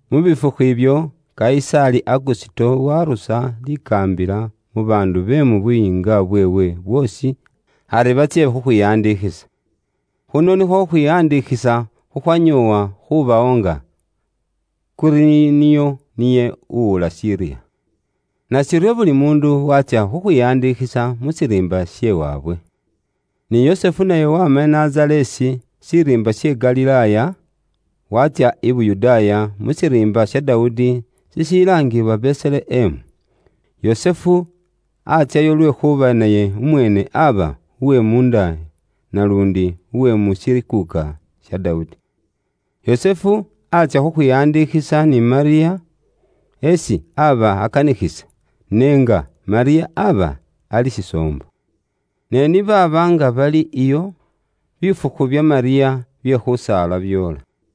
Mu bifukhu ibyo, Kayisaali Agusito waarusa likaambila mu baandu be mu buyiinga bweewe bwoosi ari batsye khukhwiwandikhisa. Khuno nikhwo khuubala babaandu khukhwanyoowa khubawo nga Kuriniyo niye uwula Siriya. Nashiryo buli muundu waatsya khukhwiwandikhisa mu shiriimba she waabwe. Ni Yusufu naye waama i Nazareesi shiriimba she Galilaaya, waatsya i Yuda, mu shiriimba sha Dawudi shishilaangibwa Beselehemu. Yusufu atsyayo lwekhuuba naye umweene aaba uwe muunda naluundi uwe mu shikuuka sha Dawudi. Yusufu aatsya khukhwiwandikhisa ni Malyamu isi aba akanikhisa, n'enga Malyamu aba ali shisoombo. Ne ni baaba nga bali iyo, bifukhu bya Malyamu bye khusaala byoola.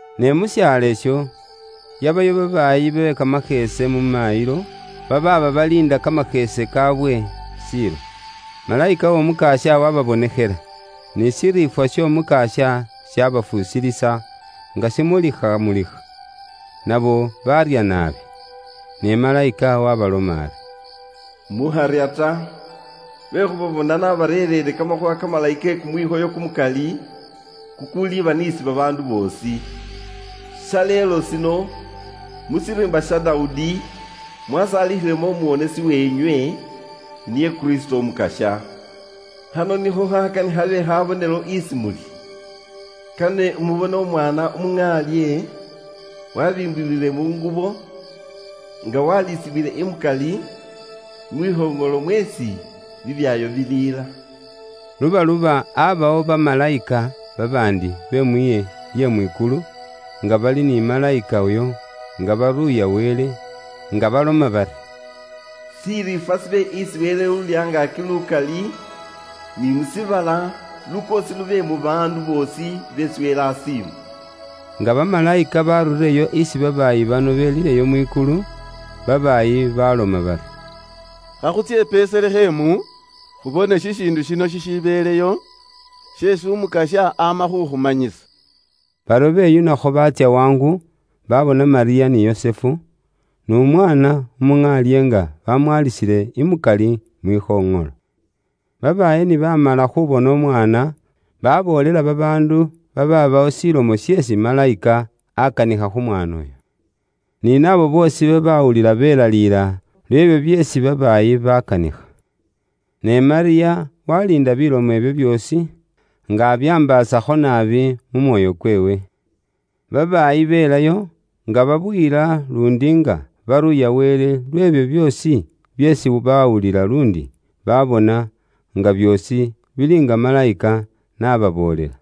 Ne mu shaalo isho, yabayo babaayi be kamasheese mu maayilo, babaaba baliinda kamasheese kaawe shiilo. Malayika w'Omukasya wababonekhela, ni shiriifwa sh'Omukasya shabafuusilisa nga shimulikhamulikha, nabo baarya naabi. Ne Malayika waabaloma ari, “Mukharya ta, lwekhuuba bona nabarereere kamakhuuwa kamalayi ke kumwikhoyo kumukali kukuliba n'isi babaandu boosi. Shaleelo shino, mu shiriimba sha Dawudi, mwasaalikhilemo Umuwonesi weenywe, niye Kristo Umukasya. Khano nikho khakane khabe khabonelo isi muli: kane mubone umwaana umuŋaalye wabiimbiwile mu ngubo, nga walisibwile imukali, mwikhoŋolo mweesi bibyaayo biliila.” Lubaluba abawo bamalayika babaandi be mwiihe lye mwikulu, nga bali ni malayika uyo, nga baruuya Wele, nga baloma bari, “Shiriifwa shibe isi Wele Uuli Angaaki Lukali, ni mu shiibala lukoosi lube mu baandu boosi beesi Wele asiima.” Nga bamalayika baarurirewo isi babaayi bano belileyo mwikulu, babaayi baloma bari, “Khakhutsye i Beselehemu, khubone shishiindu shino shishibeleyo, sheesi Umukasya ama khu khumanyisa.” Baryo beyunakho baatsya wangu, babona Malyamu ni Yusufu, n'Umwaana umuŋaalye nga bamwalisile imukali mwikhoŋolo. Babaayi ni baamala khubona Umwaana, baboolela babaandu babaabawo shilomo sheesi Malayika akanikha khu mwaana uyo, ni naabo boosi babawulila belaliila lwe'byo byeesi babaayi baakanikha. Ne Malyamu waliinda bilomo ibyo byoosi, nga abyambaasakho naabi mu mwoyo kweewe. Babaayi belayo, nga babuyila luundi nga baruuya Wele lwe'byo byoosi byeesi bawulila luundi babona, nga byoosi bili nga malayika n'ababoolela.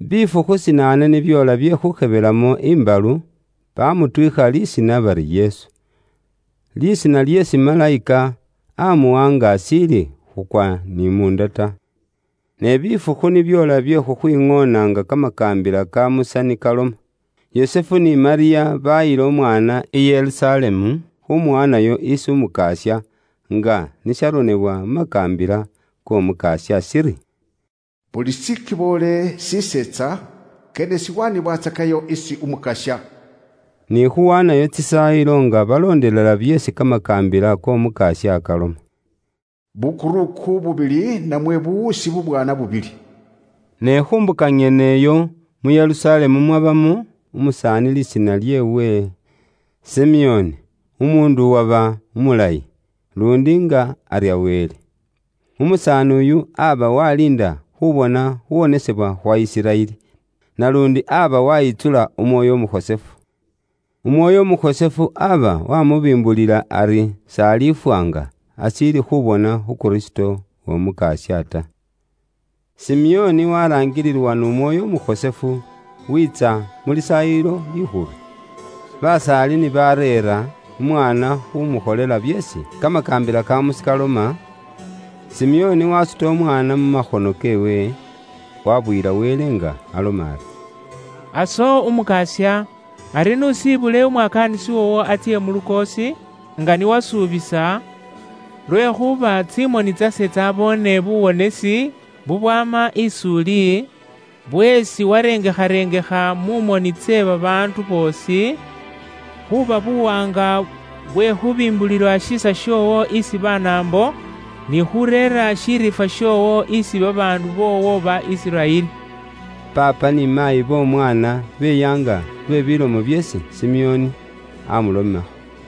Bifukhu shinaane ni byoola bye khumukhebelamo imbalu, bamutwiikha lisiina bari Yesu; lisiina lyeesi malayika amuwa nga ashiili khukwa ni munda ta. Ne bifukhu ni byoola bye khukhwiŋoona nga kamakaambila ka Musa ni kaloma, Yusufu ni Malyamu bayila umwaana i Yerusalemu khumuwaanayo isi Umukasya, nga ni sharonebwa mu makaambila k'Omukasya shiri, “Buli shikiboole shiseetsa, kane shibatsake shikhosefu isi Umukasya,” ni khuwaanayo tsisaayilo nga baloondelela byeesi kamakaambila k'Omukasya kaloma: bukuruku bubili namwe buwuusi bubwaana bubili. Ne khu mbuka nyene iyo mu Yerusalemu mwabamo umusaani lisiina lyeewe Simeoni, umuundu uwaba umulayi, luundi nga arya Wele. Umusaani uyu aba waliinda khubona khuwonesebwa khwa Isiraeli, naluundi aba wayitsula Umwoyo Umukhosefu. Umwoyo Umukhosefu aba wamubimbulila ari s'alifwa nga ashiili khubona khu Kristo w'Omukasya ta. Simeoni waraangililwa n'Umwoyo Umukhosefu, wiitsa mu Lisaayilo Likhulu. Basaali ni bareera umwaana khumukholela byeesi kamakaambila ka Musa kaloma, Simeoni wasuta Umwaana mu makhono keewe, wabuyila Wele nga aloma ari, “Aso Umukasya, ari n'usiibule umwakaanisi woowo atsye mu lukoosi, nga ni iwe ni wasuubisa, lwekhuuba tsimoni tsase tsyaboone buwonesi bubwama is'uli, bweesi warengekharengekha mu moni tse babaandu boosi, khuuba buwaanga kwe khubimbulila shiisa shoowo isi Banaambo, ni khureera shiriifwa shoowo isi babaandu boowo ba Isiraeli.” Paapa ni Maayi b'Omwaana beyaanga lwe bilomo byeesi Simeoni aamulomakho.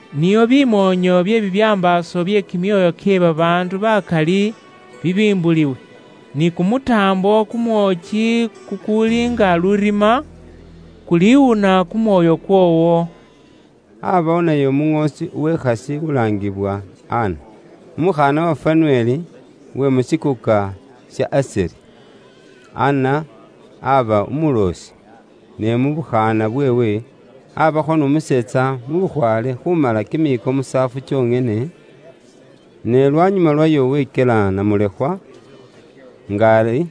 nio bimoonyo bye bibyambaaso bye kimyoyo kye babaandu bakali bibimbuliwe. Ni kumutaambo kumwooki kukuuli nga lurima, kuliwuna kumwoyo kwoowo.” Aabawo naye umuŋoosi uwekhasi ulaangiwa Ana, umukhaana wa Fanueli, uwe mu shikuuka sha Asheri. Anna aaba umuloosi, ne mu bukhaana bweewe, aabaakho n'umuseetsa mu bukhwaale khuumala kimiiko musaafu kyonyene, ne lwanyuma lwayo wekyela namulekhwa, nga ari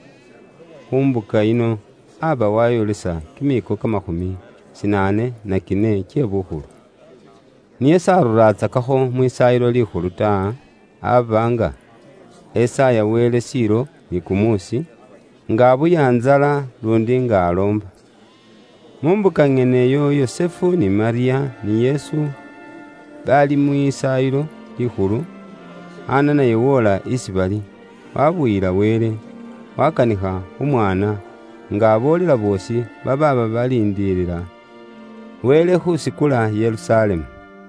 khu mbuka yino aaba waayolesa kimiiko kamakhumi shinaane na kine kye bukhulu. Niye s'aruraatsakakho Mwisaayilo Likhulu ta, aaba nga esaaya Wele shiilo ni kumuusi, nga abuya ntsala luundi nga aloomba. Mu mbuka nyeneyo nga Yusufu ni Malyamu ni Yesu bali Mwisaayilo Likhulu, Anna naye woola isi bali, waabuyilisa Wele, waakanikha khu mwaana, nga aboolela boosi babaaba baliindilila Wele khuusikula Yerusalemu.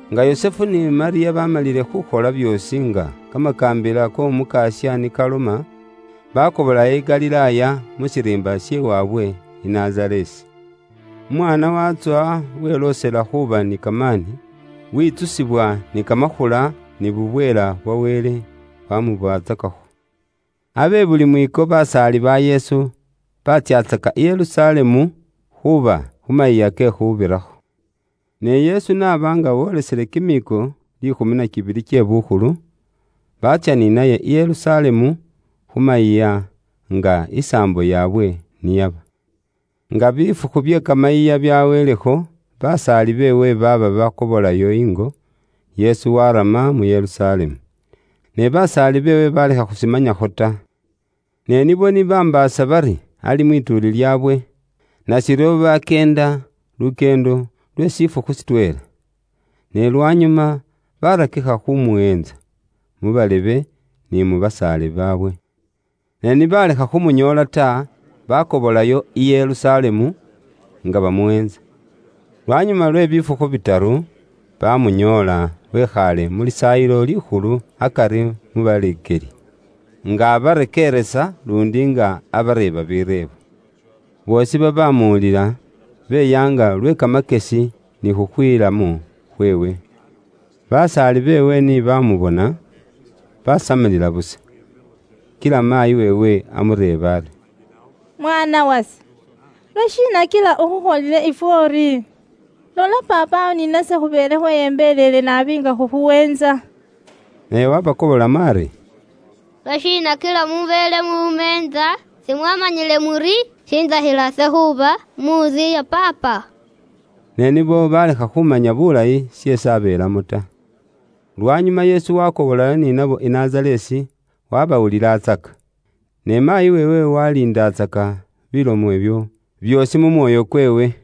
Nga Yusufu ni Malyamu baamalile khuukhola byoosi nga kamakaambila k'Omukasya ni kaloma, baakobolayo i Galilaaya, mu shiriimba she waabwe i Nazareesi. Umwaana waatsowa weloosela khuuba ni kamaani, witsusibwa ni kamakhula, ni bubweela bwa Wele bwaamubatsakakho. Abe buli mwiiko, basaali ba Yesu batsyatsaka i Yerusalemu khuuba khu Mayiiya ke Khuubirakho. Ne Yesu n'aba nga wolisile kimiiko liikhumi na kibili kye bukhulu, baatsya ni naye i Yerusalemu khu mayiiya nga isaambo yaabwe ni yaba. Nga bifukhu bye kamayiiya byaweelekho, basaali beewe baaba bakobolayo ingo, Yesu warama mu Yerusalemu. Ne basaali beewe balekha khushimanyakho ta. Ne nibo ni bambaasa bari ali mwituuli lyaabwe, nashiryo bakyeenda lukyeendo lwe shifukhu shitweela. Ne lwanyuma barakikha khumuweentsa mu balebe, ni mu basaale baabwe. Ne ni balekha khumunyoola ta, bakobolayo i Yerusalemu, nga bamuweentsa. Lwanyuma lwe bifukhu bitaru, bamunyoola wikhaale mu Lisaayilo Likhulu akari mu baleekeli, nga abarekeeresa luundi nga abareeba bireebo. Boosi babaamuwulila beyaanga lwe kamakyesi ni khukhwiilamo khweewe. Basaali beewe ni baamubona basamilila busa. Kila maayi weewe amureeba ari, “Mwaana wase, lwashiina kila ukhukholile ifwe uri? Lola paapawo ni nase khubeele khweyembeleele naabi nga khukhuweentsa.” Naye wabakobolamo ari, “Lwashiina kila mubeele mumeentsa? Simwaamanyile muri shintsakhila ise khuuba mu ntsu ya Paapa?” Ne nibo balekha khumanya bulayi sheesi abeelamo ta. Lwanyuma Yesu wakobolayo ni nabo i Nazareesi, wabawulilatsaka. Ne maayi weewe waliindatsaka bilomo ibyo byoosi mu mwoyo kweewe.